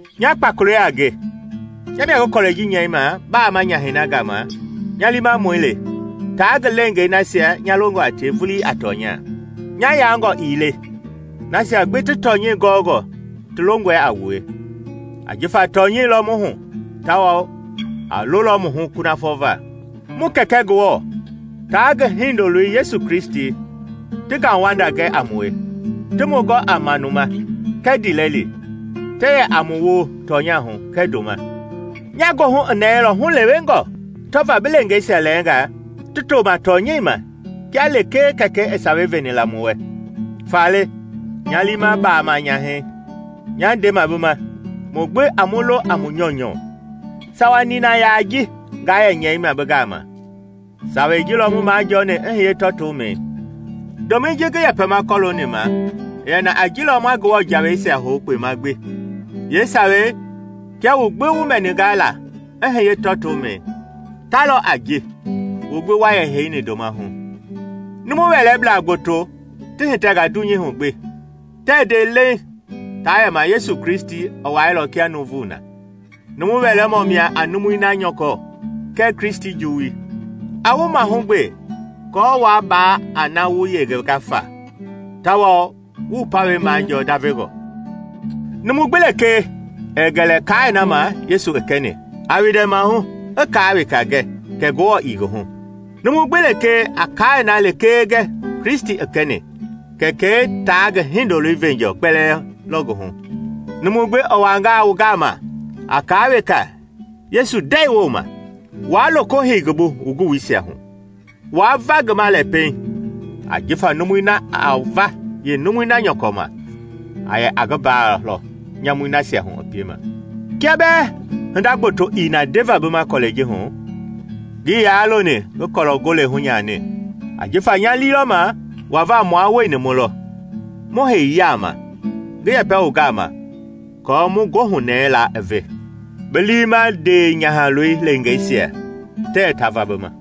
Nya Kpakolei a nge, nya mia ngi kɔlɛi ji nyɛima Baama Nyahɛi na gama nya liimamɔi le taa ngi leengei nasia nya longɔ a tie vulii a tɔnya. Nya yaangɔ ii le, nasia gbi ti tɔnyɛi gɔɔngɔ ti longɔe a wue, ajifa tɔnyɛi lɔ mu hu tawao a lolɔ mu hu kunafɔ va. Mu Kɛkɛ Ngewɔ taa ngi Hindoloi Yesu Kristi ti ngauwanda gɛ a mue, ti mu gɔ a manuma, kɛɛ ndiilɛli, ti yɛ a mu woo tɔnya hu kɛɛ ndoma. Nya goohu i nɛɛilɔ hulewengɔ tɔva bi leengeisia lɛɛnga ti toma tɔnyɛi ma kia lekee Kɛkɛi i sawei veni la mu wɛ. Faale, nya liima Baama Nyahɛi, nyaa ndema bi ma: mu gbi a mu lo a mu nyɔunyɔu. Sawa nina yaa ji ngaa yɛ nyɛima bi gama; sawei ji lɔ mu majɔɔni i hiye tɔɔtomɛi. Ndomɛi ji ngi yɛpɛma kɔlooni ma i yɛni a ji lɔ ma Ngewɔ jaweisia hou kpema gbi. Yeesawei, kia wu gbi wu mɛninga la i hiye tɔɔtomɛi, ta lɔ a ji wu gbi wa yɛ heini ndoma hu. Numu wɛlɛblaa gboto ti hitɛnga dunyei hu gbi, tɛɛ nde leiŋ taa yɛma Yesu Kristi i wailɔ kia nuuvu na. Numu wɛlɛmɔ mia a numui na nyɔkɔ kɛɛ Kristi juwui. A wu mahugbe aako waa baa a na wu yengenga fa tawao wu wu pawɛi majɔɔ ndavengɔ. Numu gbi lekee ɛɛ gɛlɛ kaai na ma Yesu i kɛni, a windɛ maahu i kaa weka gɛ, Kɛ Ngewɔ ii ngi hu. Numu gbi lekee a kaai na lekee gɛ Kristi i kɛni, Kɛkɛi taa ngi Hindoloi veenjɔɔ kpɛlɛɛ lɔ ngi hu. Numu gbi i wangaa wu gama a kaa weka Yesu ndɛi wooma, waa loko hei ngi bu wu guwuisia hu; waa va ngi ma lɛ pɛiŋ. Ajifa numui na a va yeenumui na nyɔkɔ ma a yɛ a ngi mbaa lɔ nyamui nasia hu i piema. Kia bɛɛ hinda gboto i na ndeva bi ma kɔlɛi ji hu, ngii yaa loni ngi kɔlɔ-gole hunyani, ajifa nya lii lɔ ma wava mua wueni mu lɔ, mu hei yaama, ngi yɛpɛ wu gama aako mu goohunɛɛi laa i ve. Bi liima ndeenyahaloi leengeisia tɛɛ ta va bi ma.